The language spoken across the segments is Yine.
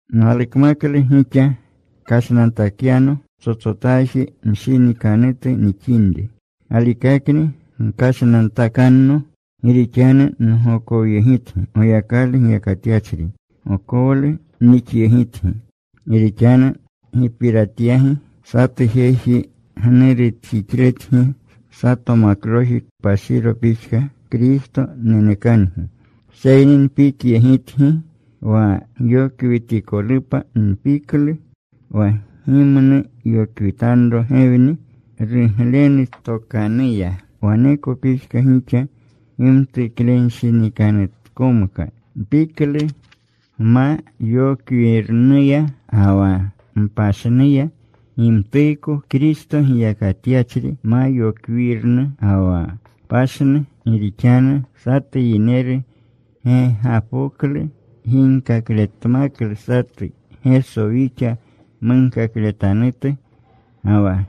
Nalukmaklu gixa kashnantakyano ptsotsotaji mshinikanutu nixinri. Galikakni gkashnantakanno. Gi rixanu ngokowyegitgi. Goyakalu giyakatyachri gokowlu nixyegitgi. Gi rixanu nupiratyagi satu jeji gnurutjixletgi sato makloji kpashiro pixka. Kristo nenekangi. Seyni npikyegitgi wa gyokwitikolupa. Npiklu wa gimnu yokwitanro Gewni ruglenu tokanuya, waneko pixka gixa gimtuklenshinikanutkomka. Npiklu gma yokwirnuya ga wa mpashirnuya gimtuuko Kristo giyakatyachri ma yokwirnu ga wa pashirnu. Gi rixanu satu yineru gegapoklu ginkakletmaklu satu Geso wixa munkakletanutu, ga wa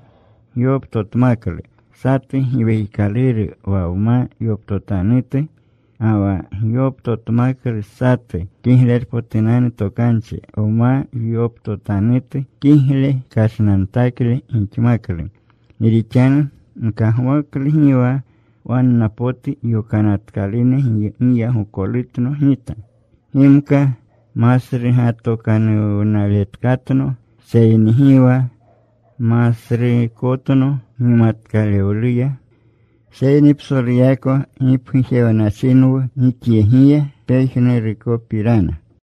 gyoptotmaklu satu giwekikaluru wa gma yoptotanutu, ga wa gyoptotmaklu satu kiglerpotunanu tokanchi gma yoptotanutu, kigle kashnantakle gixmaklu. Gi rixanu nkagwaklu gi wa wanna potu yokanatkalune giyagolutno gita. Gimka masrugatokanuwnaletkatno, seyni gi wa masruukotno gimatkalewluya. Seyni psoluyako gipgujewnachinwu gixyegiya pejnurukopirana.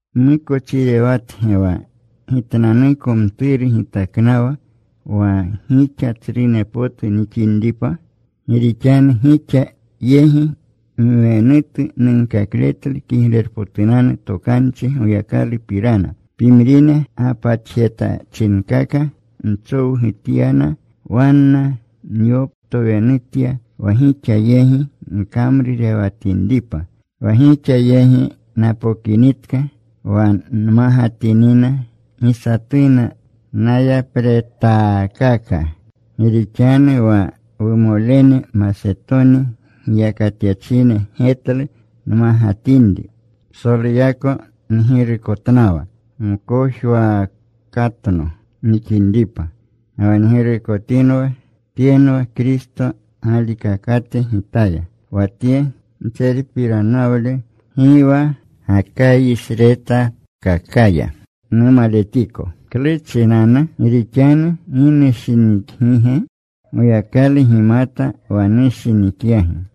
¿Nmukochirewatge wa gitnanuko mturu gitaknawa wa gixa tsrune potu gixinripa? Gi rixanu gixa yegi mwenutu nunkakletlu Kiglerpotunanu Tokanchi Goyakalupirana. Pimrine gapatjetachinkaka nchowgutyana. Wanna nyoptowenutya wa gixa yegi nkamrurewatinripa. Wa gixa yegi napokinitka wa nmagatinina, gi satuna nayapretaakaka. Gi rixanu wa wumolene Masetoni giyakatyachine getlu nmagatinri. Psoluyako ngirukotnawa mkojwaakatno nixinripa, ga wa ngirukotinwa. Tyenwa Kristo galikakate gitaya, wa tye ntserpiranawle gi wa Gakayisretatkakaya numaletiko. ¿Klu chinanu? ¿Gi rixanu gi nushinikgige? Goyakalu gimata wa nushinikyagi.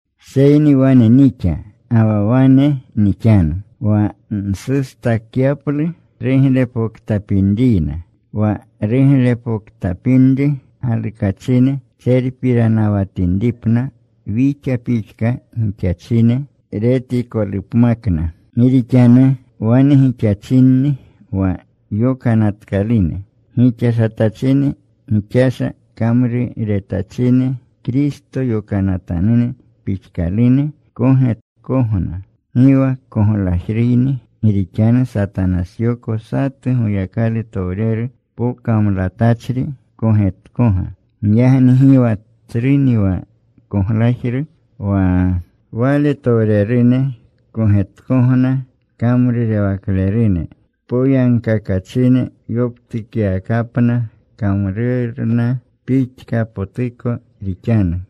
Seyni wane nixa, ga wa wane nixanu wa nsustakyaplu ruglepoktapinriyna wa ruglepoktapinri galukachine tserpiranawatinripna wixa pixka gixachine retikolupmakna. Gi rixanu wane gixachinni wa yokanatkalune gixashatachine, gixasha kamruretachine. Kristo yokanatanune pixkalune kogetkogna. Gi wa koglajruni. Gi rixanu Satanasyoko satu Goyakalutowreru pokamlatachri kogetkoga. Giyagni gi wa tsruni wa koglajru wa waletowrerune kogetkogna kamrurewaklerune poyagkakachine. Yoptukyawakapna kamrurna pixkapotuko rixanu.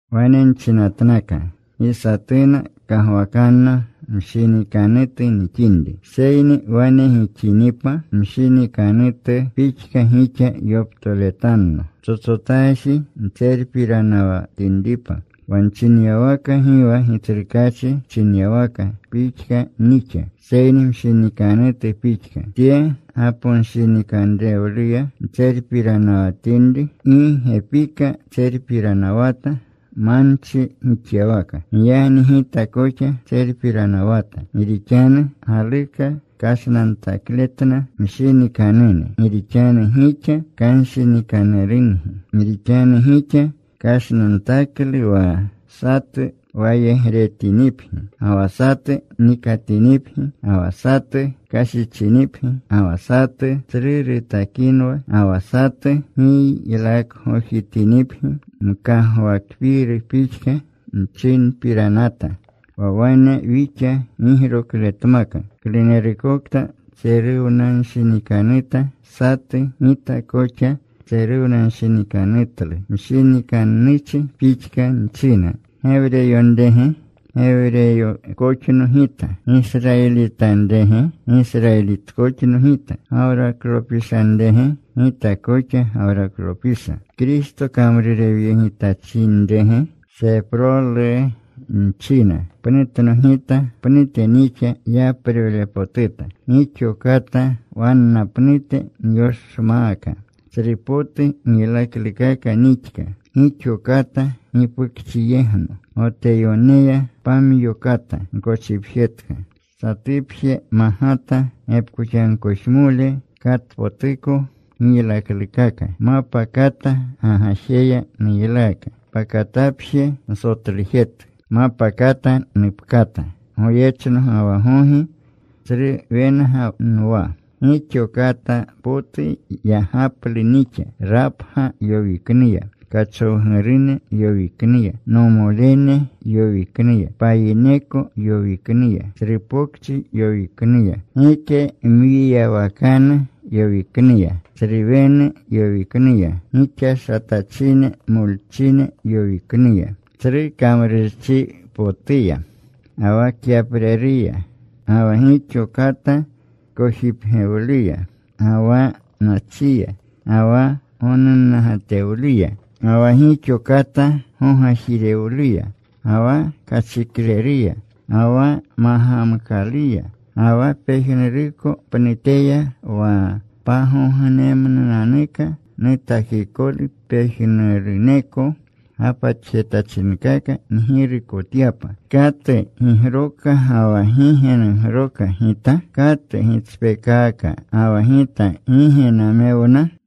Wane nchinatnaka, gi satuna kagwakanno mshinikanutu nixinri. Seyni wane gixinipa, mshinikanutu pixka gixa yoptoletanno, ptsotsotaji ntserpiranawatinripa. Wa nchinyawaka gi wa Gitsrukaachi chinyawaka pixka nixa, seyni mshinikanutu pixka, tye gaponshinikanrewluya ntserpiranawatinri. Gi gepika tserpiranawata manchi gixyawaka. Giyagni gita koxa tserpiranawata. Gi rixanu galuka kashnantakletna mshinikanune gi rixanu gixa kanshinikanurungi. Gi rixanu gixa kashnantaklu wa satu wayegretinipgi, ga wa satu nikatinipgi, ga wa satu kashichinipgi, ga wa satu tsru rutakinwa, ga wa satu giylakgojitinipgi. Mkagwakpiiru pixka nchinpiranata, wa wane wixa gigrokletmaka. Klunerukokta tseruwanshinikanuta satu, gita koxa tseruwanshinikanutlu. Mshinikannuchi pixka nchina. ¿Gewreyonrege? Gewreykoxno gita. ¿Gisrayilitanrege? Gisrayilitkoxno gita. ¿Gawraklopishanrege? Gita koxa Gawraklopisha. ¿Kristo kamrurewyegitachinrege? Seprolu nchina. Pnutno gita. Pnute nixa yaprewlepotuta. Gixa kata wanna pnute nyoshmaaka. Tsrupotu giylaklukaka nixka. Gixo kata gipukchiyegno. Goteyoneya pamyo kata nkochipjetka. Satupje magata gepkoxamkojmole katpotuko giylaklukaka. Mapa kata gagajeya nuylaaka. Pakatapje nsotlujetka. Mapa kata nupkata. Goyechno ga wa gogi tsru wenga nwa. Gixo kata potu yagaplu nixa, rapga yowiknuya, kachowgurune yowiknuya, nomolene yowiknuya, payineko yowiknuya, tsru pokchi yowiknuya, gike mwiyawakanu yowiknuya, tsru wenu yowiknuya, gixashatachine molchine yowiknuya. Tsru kamrurchipotuya, ga wa kyapreruya, ga wa gixo kata kojipgewluya, ga wa nachiya, ga wa gonunnagatewluya, ga wa gixo kata gogajirewluya, ga wa kachikleruya, ga wa magamkaluya. Ga wa pejnuruko pnuteya wa pagognemnunanuka nutakikolu pejnuruneko gapatjetachinkaka ngirukotyapa. ¿Katu gigroka ga wa gi ge nugroka gita? ¿Katu gitspeekaaka, ga wa gita gi ge namewna?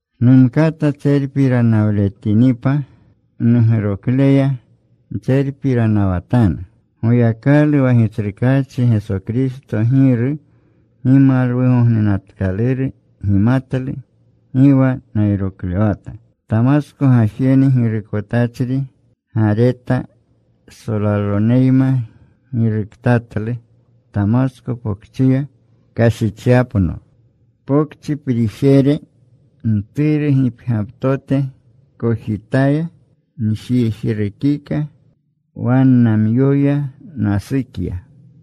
Numkata tserpiranawletinipa, nugrokleya ntserpiranawatanu. Goyakalu wa Gitsrukaachi Geso Kristo Giru gimalwugognenatkaluru gimatlu gi wa nayroklewata. Tamasko gajene girukotachri Gareta solaloneyma giruktatlu Tamasko Pokchiya kashichyapno. Pokchi prijere mturu gipgyaptote kojitaya njijrukika. Wannamyoya nasukya.